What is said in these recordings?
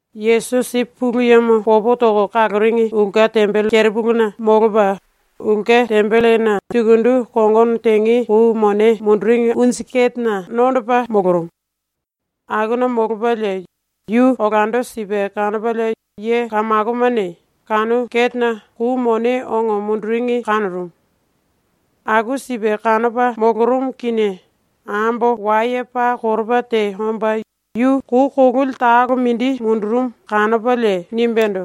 Yesusi ⸤Pulu Yemo popo toko kaloringi ulke tembele kerepuluna molopa⸥ ulke tembelena sukundu kongono tenge kou mone munduringi unju ketena nondopa molorumu. Akuna molopalie yu olando sipe kanopalie ye kamakomane kanu ketena kou mone ongo munduringi kanorumu. ⸤Aku sipe kanopa molorumu kinie⸥ ambo waye paa koropa te omba yu kou kololi talo mindi mundurumu kanopalie nimbendo: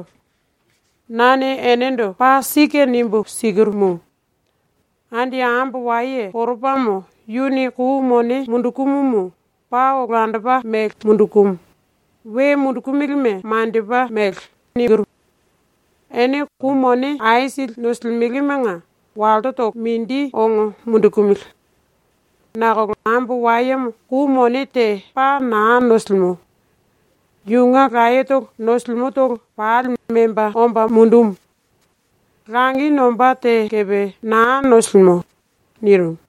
“Nane enendo paa sike nimbu sikirumu: Andi ambo waye koropamo yuni kou mone mundukumumu paa olandopa mele mundukumu, we mundukumilime maniendopa mele. Ene kou mone aisili nosilimelemanga wallotolo mindi ongo mundukumili. Nakolo ambo wayemo kou mone te paa naa nosilimo. Yunge layetolo nosimutolo pali memba omba mundumu. Langi nombá te kepe naa nosilimo.” nirimu.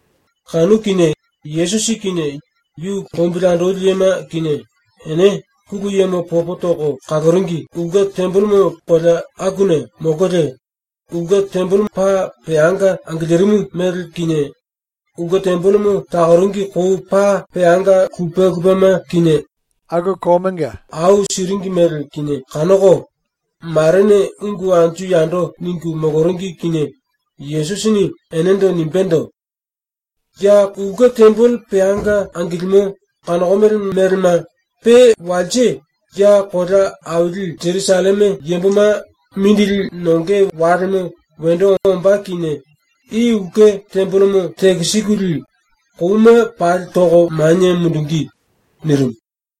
Kanu kinie Yesusi kinie yu lombili andoli yema kinie ene ⸤Pulu Yemo popo toko kaloringi⸥ ulke tembele kolea akuna molkolie ulke tembelemo paa peanga angilirimu mele kinie ulke tembelemo takoringi kou paa peanga lupe lupema kinie aku kouna au siringi mele kinie kanoko, marene ungu anju yando ningu moloringi kinie Yesusini enendo nimbendo: “Ya ⸤ulke tembele peanga angilimo⸥ kanokomele melema ⸤pe walse ya kolea aili Jerusalleme yamboma mindili nonge walemo wendo ombá kinie⸥ i ulke tembelemo tekisikulie kouma pali toko manie mundungí.” nirimu.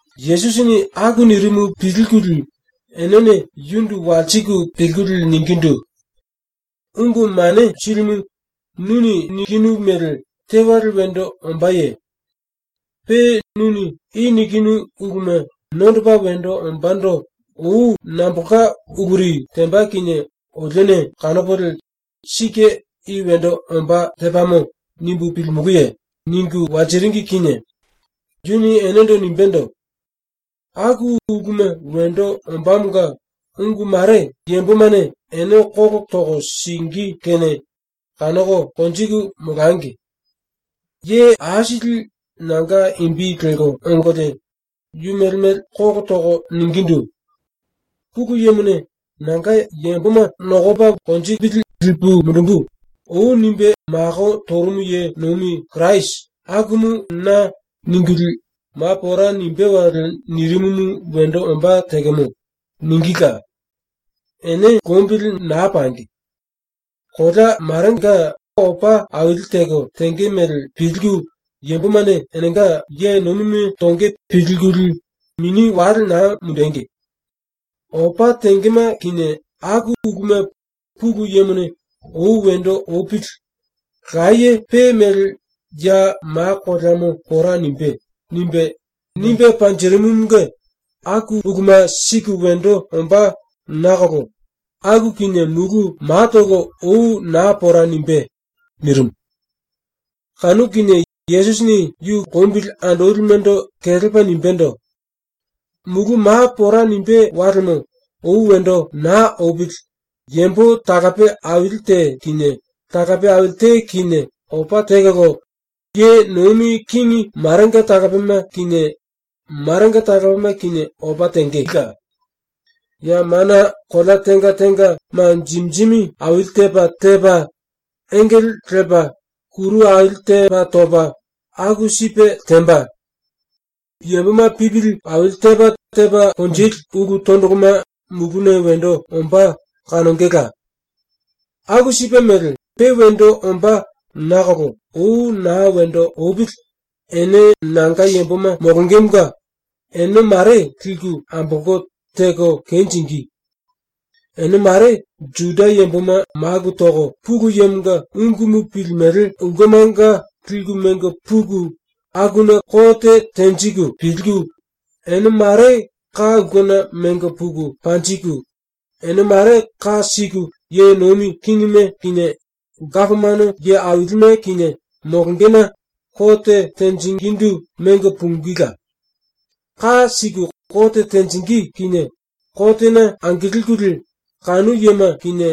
Yesusini aku nirimu pilkulie enene yundu walsiku pilkulie ningindu: “Ungu Mane Silimu, nuni nikinu mele tewale wendo ombáye? Pe nuni i nikinu uluma nondopa wendo ombándo ou nambolka uluri temba kinie olione kanopolie ‘Sike i wendo ombá tepamo.’ nimbu pilimulúye?” ningu walsiringi kinie yuni enendo nimbendo: “⸤Aku uluma wendo ombámonga ungu mare⸥ yambomane ene kolo toko singí kene kanoko konjiku molangi. Ye aisili nanga imbi lelko ongolie yu mele mele kolo toko ningindu: “⸤Pulu Yemone ‘Nanga yamboma nokopili lipu mundumbu.’ ou nimbe mako torumu ye nomi Kirasi⸥ akumu na.” ningulie, “⸤Ma pora nimbé⸥ wale nirimumu wendo ombá tekemo.” ningíla. Ene lombili naa pangi. Kolea marenga opa aili teko tenge mele pilku, yambomane enenga ye nomime tonge pilkulie mini wale naa mundengi. Opa tengema kinie aku uluma Pulu Yemone ‘Ou wendo opili. Laye pe mele ya ma koleamo pora nimbé.’ nimbe, nimbe panjirimumunge aku uluma sike wendo ombá nakolo aku kinie mulu matolo ou naa pora nimbé.” nirimu. Kanu kinie Yesusini yu lombili andolimendo kelepa nimbendo: “⸤Mulu ma pora nimbé walemo ou wendo naa opili⸥ yambo talape aili te kinie talape aili te kinie opa tekolo, ye nomi kingi marenga talapema kinie marenga talapema kinie opa tenge. Ya mana kolea tenga tenga ma jimi jimi aili tepa tepa, engele lepa, kuru aili tepa topa, aku sipe temba. Yamboma pipili aili tepa tepa konjili ulu tondoloma muluna wendo ombá kanongela. “Aku sipe mele ⸤pe wendo ombá nakolo⸥ ou naa wendo opili ene nanga yamboma molongemonga ene ⸤mare⸥ liku ambolko, teko kenjingí. Ene ⸤mare⸥ Juda yamboma maku toko Pulu Yemonga ungumu pilimele ulkemanga liku mengo puku ⸤akuna kote tenjiku⸥, ene ⸤mare⸥ ka ulkena mengo puku panjiku, ene ⸤mare ka siku⸥ ye nomi kingime kinie gapomano ye ailime kinie molongena ⸤kote tenjingindu⸥ mengo pungíla. ⸤Ka siku kote tenjingí kinie kotena angilkulie kanu yema kinie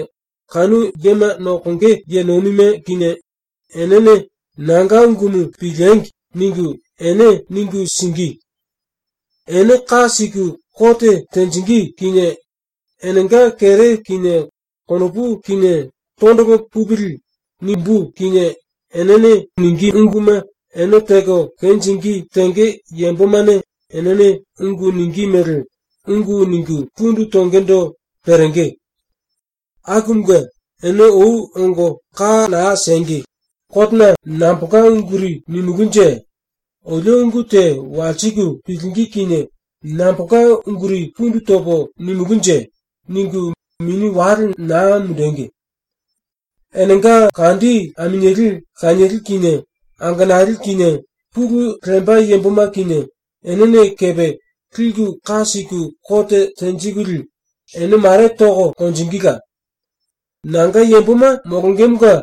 kanu yema nokonge ye nomime kinie⸥ enene ‘Nanga ungumu piliengi!’ ningu, ene ningu singí. Ene ka siku kote tenjingí kinie ‘Enenga kere kinie konopu kinie tondolo pupili.’ nimbú kinie enene ningí unguma ene teko kenjingí tenge yambomane enene ungu ningí mele ungu ningu pundu tongendo perenge. Akumunge ene ou ongo ka naa siengi ‘Kotena nambolka unguri nimulúnje? Olio ungu te walsiku pilingí kinie nambolka unguri pundu topo nimulúnje?’ ningu mini wale naa mundengi. “Enenga kandi aminieli lanieli kinie angenali kinie, pulu lemba yamboma kinie, enene kepe liku ka siku kote tenjikulie ene mare toko konjingíla. Nanga yamboma molongemonga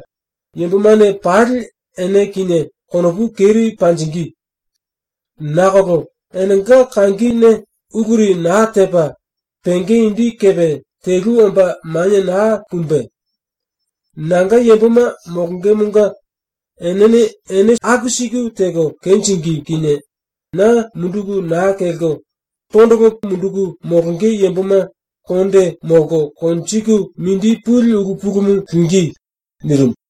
yambomane pali ene kinie konopu keri panjingí. Nakolo enenga kangine uluri naa tepa penge indi kepe telu omba manie naa pumbe. ⸤Nanga yamboma molongemonga enene ene aku siku teko kenjingí kinie⸥ na munduku naa kelko tondolo munduku molonge yamboma mini pali konde molko konjiku mindi puli ulu pulumu lingí.” ⸤nirimu.⸥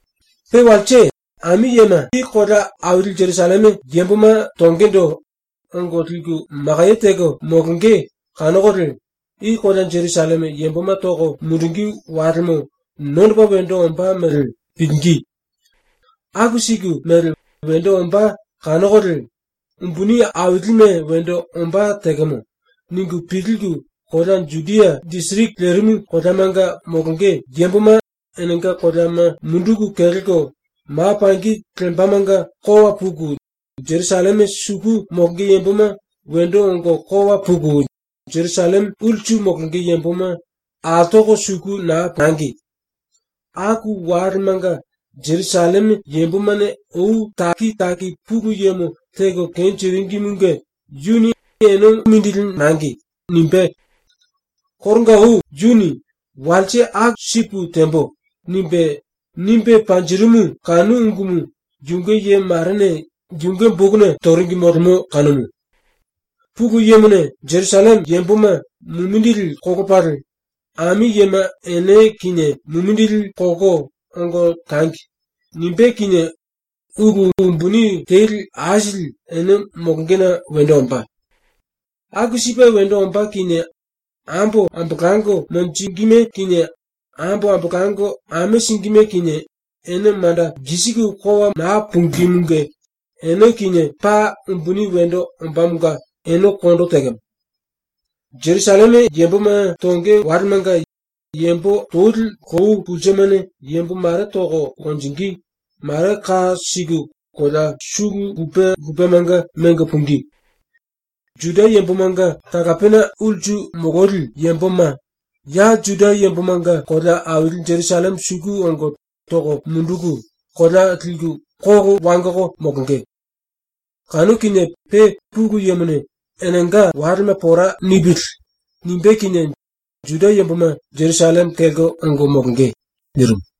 “Pe walse, ami yema i kolea aili Jerusalleme yamboma tongendo ongo liku makaye teko molonge kanokolie i kolea Jerusalleme yamboma toko mundungí walemo nondopa wendo ombá mele pilingí. ⸤Aku siku mele wendo ombá kanokolie ‘Umbuni ailime wendo ombá tekemo.’ ningu pilku⸥ kolea Judia disiriki lerimu koleamanga molonge yamboma ⸤enenga koleama munduku kelko⸥ ma pangi lembamanga kowa puku, Jerusalleme suku molonge yamboma wendo ongo kowa puku, Jerusalleme ulsu molonge yamboma altoko suku naa pangi. Aku walemanga Jerusalleme yambomane ou taki taki Pulu Yemo teko kenjiringimunge yuni ene mongo simbe. Koronga ou yuni ‘Walse aku sipu tembo.’ nimbe, nimbe panjirimu kanu ungumu yunge ye marene yunge bokuna toringi molemo kanumu. “⸤Pulu Yemone⸥ Jerusalleme yamboma mumindili kolopalie ‘Ami yema ene kinie mumindili kolko ongo tangi.’ nimbé kinie ulu umbuni teli aisili ene molongena wendo ombá. “Aku sipe wendo ombá kinie ambo ambolango monjingíme kinie, ambo ambolango ame singíme kinie, ⸤ene manda lkisiku kowa naa pungímunge⸥ ene kinie paa umbuni wendo ombámonga ene kondo tekemo. Jerusalleme yamboma tonge walemanga yambo toli lou pulsemane yambo mare toko konjingí, mare ka siku kolea sulu lupe lupemanga mengo pungí. Juda yambomanga talapena ulsu mololi yamboma ya Juda yambomanga kolea aili Jerusalleme suku ongo toko munduku kolea liku kolo wangoko molonge. Kanu kinie pe Pulu Yemone ‘Enenga walema pora nipili.’ nimbé kinie Juda yamboma Jerusalleme kelko ongo molonge.” nirimu.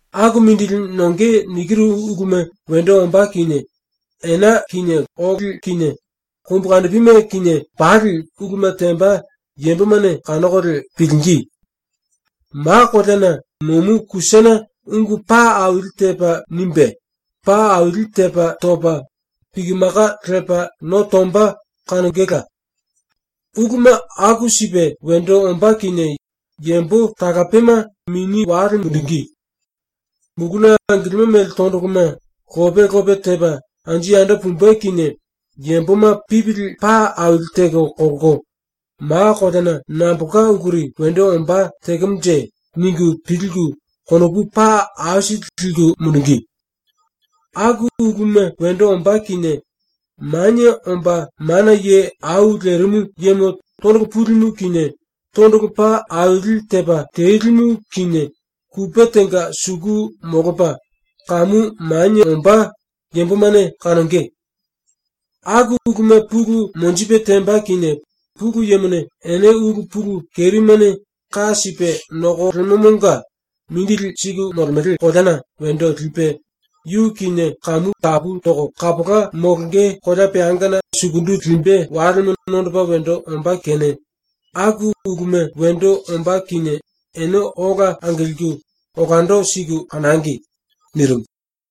“⸤Aku mindili nonge nikiru uluma wendo ombá kinie⸥ ena kinie óli kinie kombukandipime kinie ⸤pali⸥ uluma temba yambomane kanokolie pilingí. Ma koleana nomu kusane ungu paa aili tepa nimbe, paa aili tepa topa piki maka lepa no tomba kanongela. Uluma aku sipe wendo ombá kinie yambo talapema mini wale mundungí. Muluna angilimo mele tondoloma lope lope tepa anju yando pumbe kinie yamboma pipili paa aili teko kolko ‘Ma koleana nambolka uluri wendo ombá tekemonje?’ ningu pilku konopu paa aisili liku mundungí. Aku uluma wendo ombá kinie Manie Omba Mana Ye Au Lerimu Yemo tondolo pulimu kinie, tondolo pa aili tepa telimu kinie, kupe tenga suku molopa, kamu manie ombá yambomane kanonge. “Aku uluma pulu monjipe temba kinie Pulu Yemone ene ulu pulu kerimene ka sipe nokolemomonga mindili siku molemele koleana wendo lipe, yu kinie kamu tapu toko kapola molonge kolea peangana sukundu limbe walemo nondopa wendo ombá kene aku uluma wendo ombá kinie ene ola angilku olando siku kanangi.” nirimu.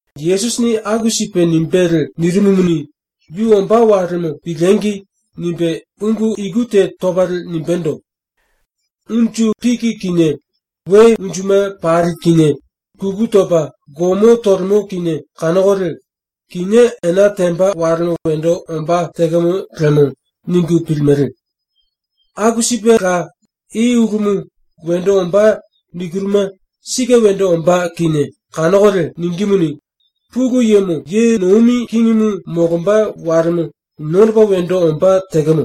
⸤Yesusini aku sipe nimbelie nirimumuni, yu ombá walemo ‘Piliengi!’ nimbe⸥ ungu iku te topalie nimbendo: “Unju piki kinie we unjuma pali kinie kuku topa gomo tolemo kinie kanokolie ‘Kinié ena temba walemo wendo ombá tekemo lemo.’ ningu pilimele. Aku sipela i ulumu “Wendo ombá.” nikiruma sike wendo ombá kinie kanokolie ningímuni, “Pulu Yemo ye nomi kingimu molomba walemo nondopa wendo ombá tekemo.”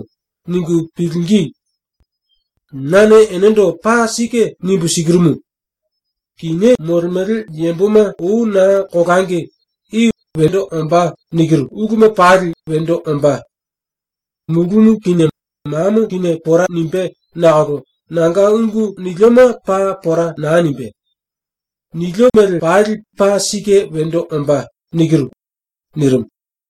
ningu pilingí. “Nane enendo paa sike nimbu sikirumu: Kinié molemele yamboma ou naa kolangi ⸤i “Wendo ombá.” nikiru⸥ uluma pali wendo ombá. Mulumu kinie mamo kinie pora nimbé nakolo nanga ungu nilioma paa pora naa nimbé. ⸤Nilio mele pali paa sike wendo ombá.⸥” ⸤nirimu.⸥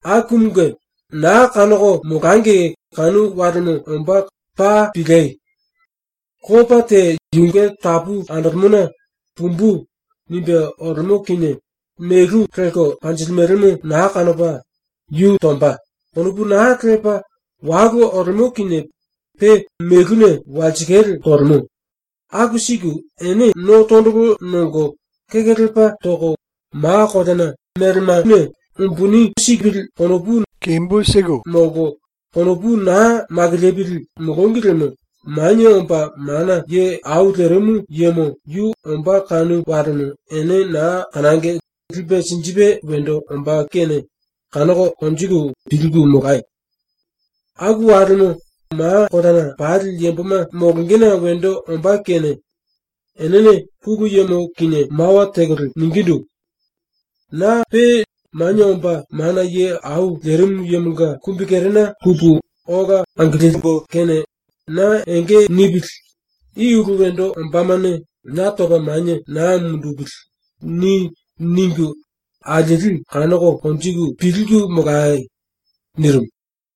“Akumunge naa kanoko molangi kanu walemo ombá paa piliei! Lopa te yunge tapu andolemona ‘Pumbu.’ nimbe olemo kinie melu lelko panjilimelemo naa kanopa ‘Yu tomba.’ konopu naa lepa walu olemo kinie pe meluna walsikale tolemo, aku siku ene no tondolo nongo kekelepa toko we umbuni tepili molko konopu naa makilipili molongi liemo ⸤Manie Omba Mana Ye Au Lerimu Yemo⸥ yu ombá kanu walemo ene naa kanangi lipe sinjipe wendo ombá kene kanoko konjiku pilku molayo. Aku walemo ma koleana pali yamboma molongena wendo ombá kene enene Pulu Yemo kinie mawa tekolie ningindu: “‘Na pe Manie Omba Mana Ye Au Lerimu Yemonga kumbikerena pupu ola angiliembo kene na enge nipili, i ulu wendo ombámane na topa manie naa mundupili.’ ni.” ningu alieli kanoko konjiku pilku molai!” nirimu.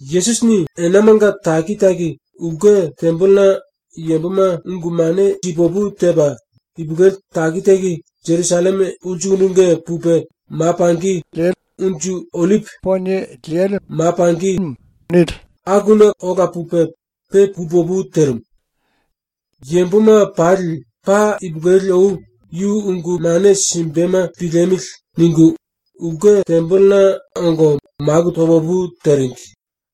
Yesusini enamanga taki taki ulke tembelena yamboma ungu mane si pu opu tepa, ipulueli taki taki Jerusalleme ulsukundunge pupe ma pangi Unju Ollipi Poniena ola pupe pe pu opu terimu. Yamboma pali paa ipulueli ou ‘Yu ungu mane simbema piliemili.’ ningu ulke tembelena ongo maku to pu opu teringi.